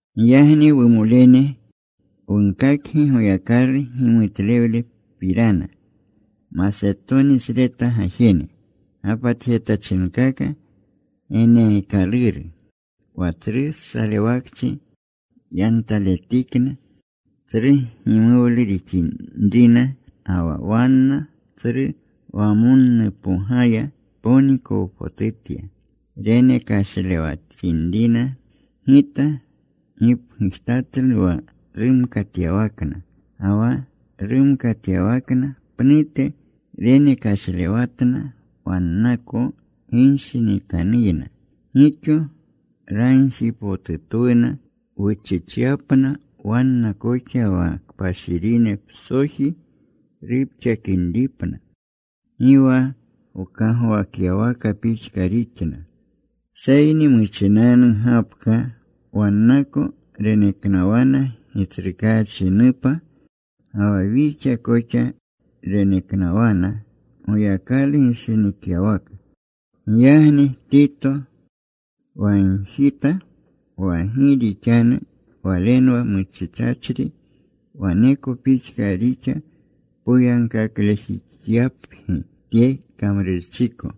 Giyagni, wumolene, wunkakgi Goyakalu gimutlewlepirana, Masetonisreta gajene gapatjetachinkaka geneekaluru. Wa tsru salewakchi yantaletikna, tsru gimuwlu rixinrina ga wa wanna tsru wamonnupogaya, ponikowpotutya renekashlewatinrina. Gita gipgujtatlu wa rumkatyawakna, ga wa rumkatyawakna pnute, renekashlewatna wannako ginshinikanuyna. Gixo ragjipotutwuna wuchichyapna wanna koxa wa kpashirine psoji rupxakinripna. Gi wa wkagwakyawaka pixka rixna, seyni muchinanu gapka wannako reneknawana Gitsrukaachinupna. Ga wa wixa koxa reneknawana Goyakalu gishinikyawaka. Giyagni Tito wagjita wa gi rixanu walenwa muchichachri, waneko pixka rixa poyagkaklejixyapgi tye kamrurchiko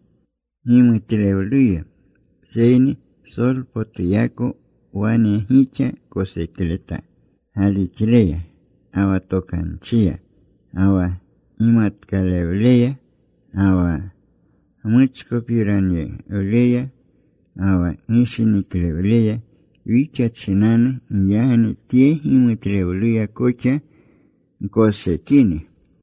gimutlewluya. Seyni psolpotuyako wane gixa kosekleta galixleya, ga wa tokanchiya, ga wa gimatkalewleya, ga wa gmuchkopiranawleya, ga wa gishiniklewleya wixa chinanu. Giyagni tye gimutlewluya koxa gkosekini.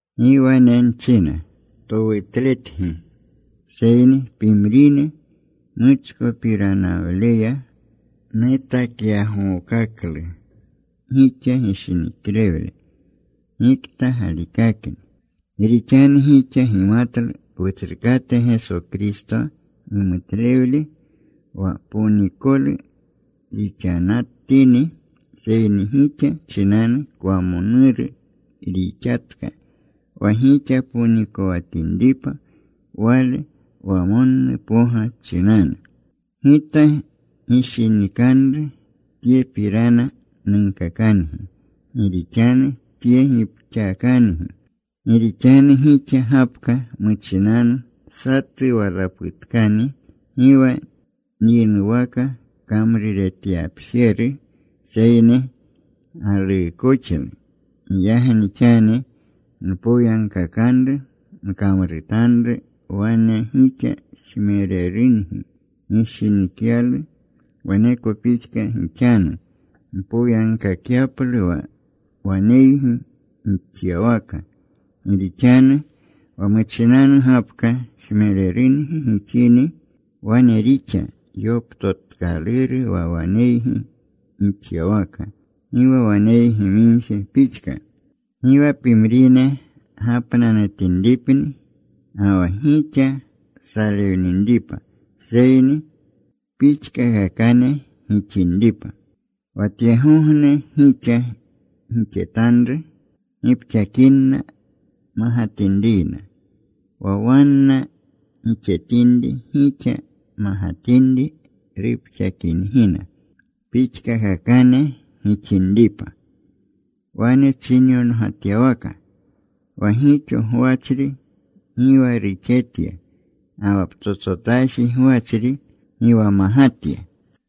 Gi wane nchina towutletgi, seyni pimrine muchkopiranawleya, nutakyagookaklu gixa gishiniklewle gikta galikakni. Gi rixanu gixa gimatlu Wutsrukate Geso Kristo gimutlewle, wa ponikolu rixanatini, seyni gixa chinanu kwamonuru rixatka wa gixa ponikowatinripa Wale wamonnupoga chinanu. Gita gishinikanru tyepirana nunkakangi. Gi rixanu tye gipxakangi. Gi rixanu gixa gapka muchinanu satu walaputkani gi wa gyinuwaka kamruretyapjeru, seyni galuukoxlu. Giyagni xani mpoyagkakanru gkamrutanru. Wane gixa jmererungi gishinikyalu, waneko pixka gixanu mpoyagkakyaplu wa waneygi gixyawaka. Gi rixanu wa muchinanu gapka jmererungi gixini, wane rixa yoptotkaluru wa waneygi gixyawaka, gi wa waneygi migje pixka. Gi wa pimrine gapnanutinripni ga wa gixa salewninripa seyni pixkakakane gixinripa. Wa tyegogne gixa gixetanru gipxakinna magatinriyna. Wa wanna gixetinri gixa magatinri rupxakingina. Pixkakakane gixinripa. Wane chinyongatyawaka: Wa gixo gwachri gi wa ruxetya, ga wa ptsotsotaji gwachri gi wa magatya.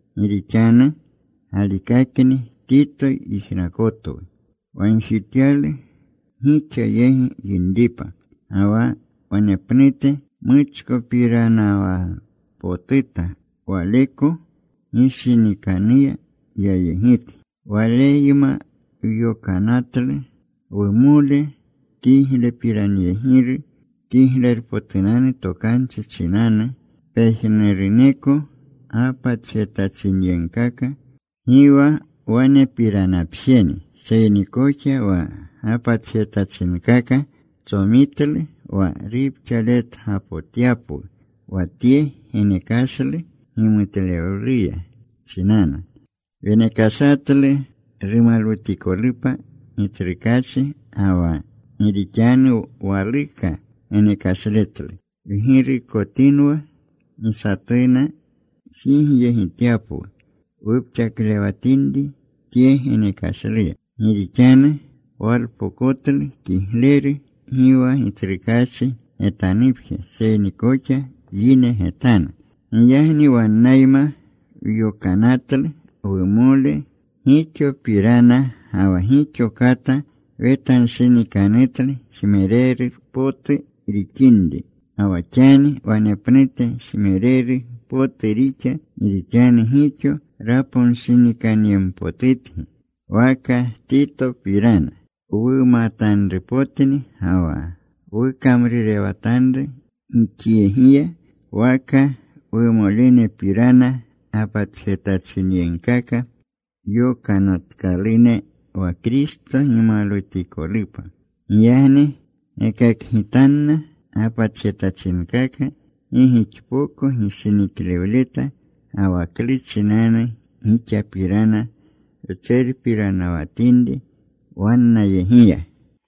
Gi rixanu galikakni Tito yijnakotwu wagjityalu gixa yegi yinripa. Ga wa wanepnute muchkopiranawpotuta waleko ginshinikanuya yayegitgi. Waleyma wyokanatlu wumole, kiglepiranyegiru Kiglerpotunanu Tokanchi chinanu, pejnuruneko gapatjetachinyegkaka. Gi wa wanepiranapjeni, seyni koxa wa gapatjetachinkaka tsomitlu wa rupxaletgapotyapwu wa tye genekashlu gimutlewluya chinanu. Wenekashatlu rumalwutikolupa Gitsrukaachi, ga wa gi rixanu waluka genekashletlu. Wgirukotinwa gi satuna jigyegityapwu wupxaklewatinri tye genekashluya. Gi rixanu walpokotlu kigleru gi wa Gitsrukaachi getanupje seyni koxa yine getanu. Giyagni wannayma wyokanatlu wumole. Gixopirana ga wa gixo kata wetanshinikanutlu jmereru potu rixinri. Ga wa xani wanepnute jmereru potu rixa gi rixanu gixo raponshinikanyempotutgi. Waka Titopirana wumatanrupotni ga wa wukamrurewatanru gixyegiya, waka wumolenepirana gapatjetachinyegkaka yokanatkalune, wa Kristo gimalwutikolupa. Giyagni gekakgitanna gapatjetachinkaka gi gixpoko gishiniklewleta, ga wa klu chinanu gixapirana wtserpiranawatinri wannayegiya.